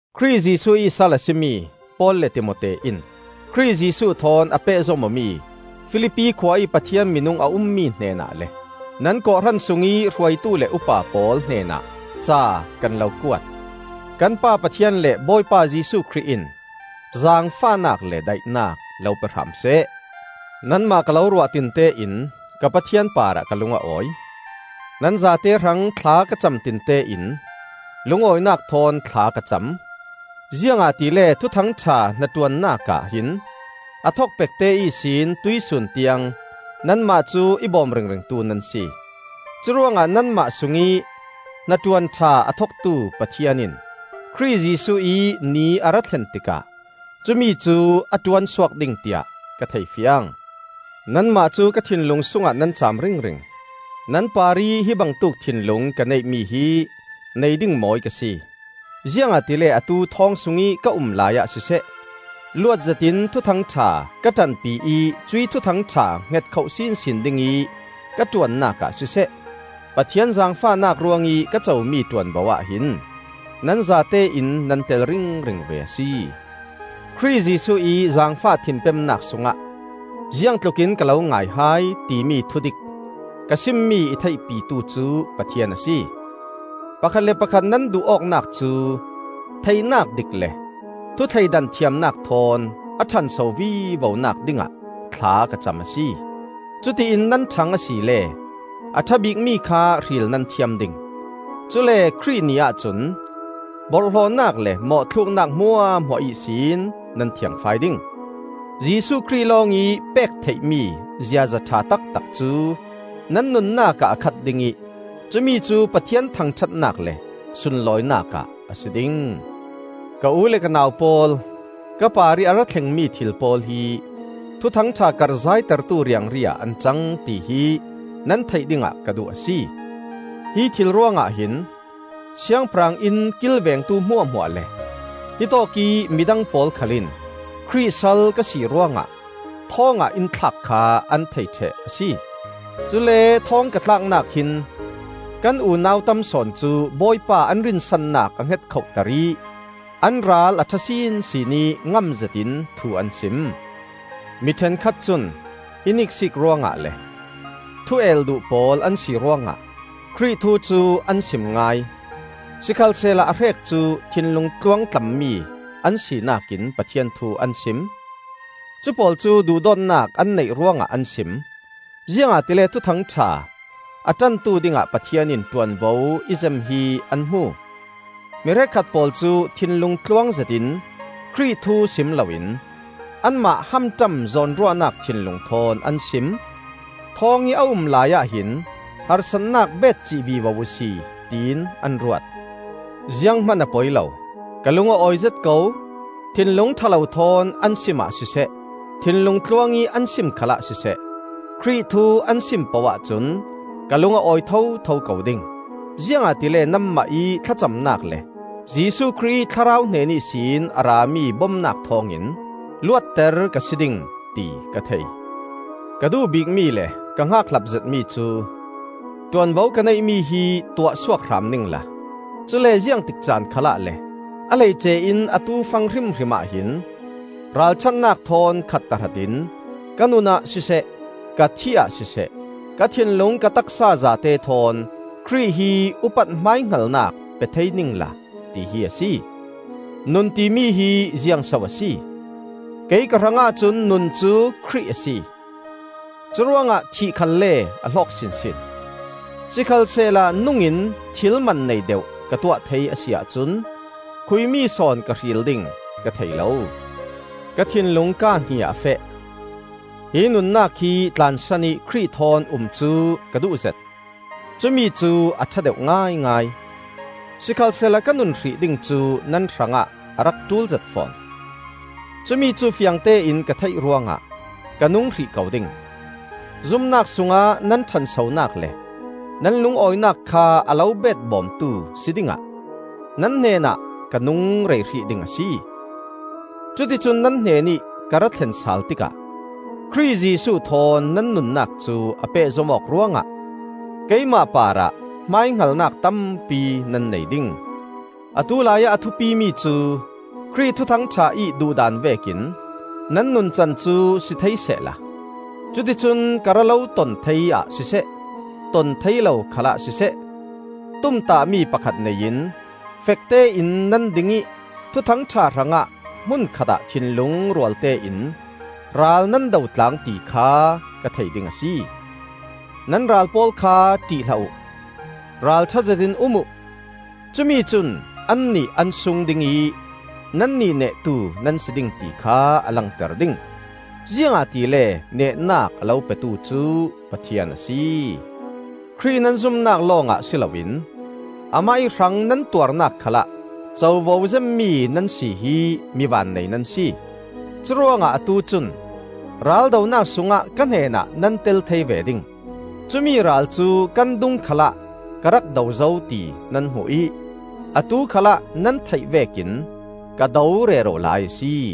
Khrih Jesuh ih sal a si mi Paul le Timote in, Khrih Jesuh thawn a pehzom awmi Filipi khua ih Pathian minung a ummi hnenah le nan kawhhran sungih hruaitu le upa pawl hnenah ca kan lo kuat. Kan Pa Pathian le Bawipa Jesuh Khrih in zaangfahnak le daihnak lo pe hram seh. Nanmah ka lo ruah tinte in ka Pathian parah ka lung a awi. Nan zate hrang thla ka cam tinte in lungawinak thawn thla ka cam, ziangahtile Thuthang ṭha hnaṭuannak ah hin a thokpekte ihsin tuihsun tiang nanmah cu i bawm ringringtu nan si. Curuangah nanmah sungih hnaṭuan ṭha a thoktu Pathian in Khrih Jesuh ih Ni a ra thlen tikah cumicu a ṭuansuak ding tiah ka thei fiang. Nanmah cu ka thinlung sungah nan caam ringring. Nan parih hi bangtuk thinlung ka neihmi hi nei ding mawi ka si. Ziangahtile atu thawng sungih ka um laiah siseh, luatzetin Thuthang ṭha ka ṭanpi ih cuih Thuthang ṭha hngetkhoh sinsin dingih ka ṭuannak ah siseh, Pathian zaangfahnak ruangih ka comi ṭuanvo ahhin nan zatein nan tel ringring ve a si. Khrih Jesuh ih zaangfah thinpemnak sungah ziangtlukin ka lo ngai hai, timi thudik ka simmi i theihpitu cu Pathian a si. Pakhat le pakhat nan duh awknak cu theihnak dik le thu thleidan thiamnak thawn a ṭhanso vivonak dingah thla ka cam a si. Cuti in nan ṭhang asile a ṭha bikmi kha hril nan thiam ding. Cule Khrih Ni ahcun borhhlawhnak le mawhthluknak hmuahhmuah ihsin nan thiangfai ding. Jesuh Khrih lawngih pek theihmi ziaza ṭha taktak cu nan nunnak ah a khat ding ih cumicu Pathian thangṭhatnak le sunlawinak ah a si ding. Ka u le ka nau pawl, ka parih a ra thlengmi thil pawl hi Thuthang ṭha karhzaitertu riangri ah an cang, tihi nan theih dingah ka duh a si. Hi thil ruangah hin, siangpahrang inn kilvengtu hmuahhmuah le hitawk ih midang pawl khal in Khrih sal ka si ruangah thawngah in thlak kha an thei ṭheh a si. Cule thawng ka tlaknak hin kan unau tam sawn cu Bawipa an rinsannak a hngetkhohter ih an ral a ṭha sinsin ih ngamzetin thu an sim. Mi ṭhenkhat cun in iksiik ruangah le thu-el duh pawl an si ruangah Khrih thu cu an sim ngai; sikhalsehla a hrek cu thinlung tluangtlammi an sinak in Pathian thu an sim. Cupawl cu duhdawtnak an neih ruangah an sim, ziangahtile Thuthang ṭha a ṭantu dingah Pathian in ṭuanvo i zem hi an hmu. Mi hrekkhat pawl cu thinlung tluang zetin Khrih thu sim loin anmah hamṭam zawnruahnak thinlung thawn an sim. Thawng ih a um laiah hin harsatnak betcih vivo uhsi tiin an ruat. Zianghman a poi lo. Ka lung a awizet ko; thinlung ṭha lo thawn an simah siseh, thinlung tluangih an sim khalah siseh, Khrih thu an sim poh ahcun ka lung a awi thotho ko ding. Ziangahtile nanmah ih thlacamnak le Jesuh Khrih ih Thlarau hnen ihsin a rami bomnak thawngin luatter ka si ding, ti ka thei. Ka duh bikmi le ka hngakhlap zetmi cu ṭuanvo ka neihmi hi tuahsuak hram ningla, cule ziangtik caan khalah le a hleice in atu fang hrimhrim ahhin, ralṭhatnak thawn khat tahratin ka nunah siseh, ka thihah siseh, ka thinlung ka taksa zate thawn Khrih hi upat hmaihngalnak pe thei ningla, tihi a si. Nun timi hi ziangso a si? Kei ka hrangah cun nun cu Khrih a si. Curuangah thih khalle a hlawk sinsin. Sikhalsehla nungin thil man nei deuh ka tuah thei a si ahcun khuimi sawn ka hril ding ka thei lo. Ka thinlung kaa hnih ah a feh. Hi nunnak hi tlansan ih Khrih thawn um cu ka duhzet; cumicu a ṭha deuh ngaingai. Sikhalsehla ka nun hrih ding cu nan hrangah a rak ṭulzet fawn. Cumi cu fiangtein ka theih ruangah ka nung hrih ko ding. Zumnak sungah nan ṭhansonak le nan lungawinak kha a lo betbawmtu si dingah nan hnenah ka nung rei hrih ding a si. Cuticun nan hnenih ka ra thlen sal tikah, Khrih Jesuh thawn nan nunnak cu a pehzom awk ruangah, keimah parah hmaihngalnak tampi nan nei ding. Atu laiah a thupimi cu Khrih Thuthang ṭha ih duhdan vekin nan nuncan cu si thei sehla, cuticun ka ra lo ton thei ah siseh, ton thei lo khalah siseh, tumtahmi pakhat nei in fektein nan ding ih Thuthang ṭha hrangah hmun khatah thinlung rualtein ral nan dotlang ti kha ka thei ding a si. Nan ral pawl kha ṭih hlah uh. Ralṭha zetin um uh. Cumi cun annih an sung ding ih nannih nehtu nan si ding ti kha a langter ding; ziangahtile nehnak a lo petu cu Pathian a si. Khrih nan zumnak lawngah si loin amah ih hrang nan tuarnak khalah covo zemmi nan si hi mi vannei nan si. Curuangah atu cun raldonak sungah ka hnenah nan tel thei ve ding. Cumi ral cu kan dung khalah ka rak do zo ti nan hmu ih, atu khalah nan theih vekin ka do rero lai a si.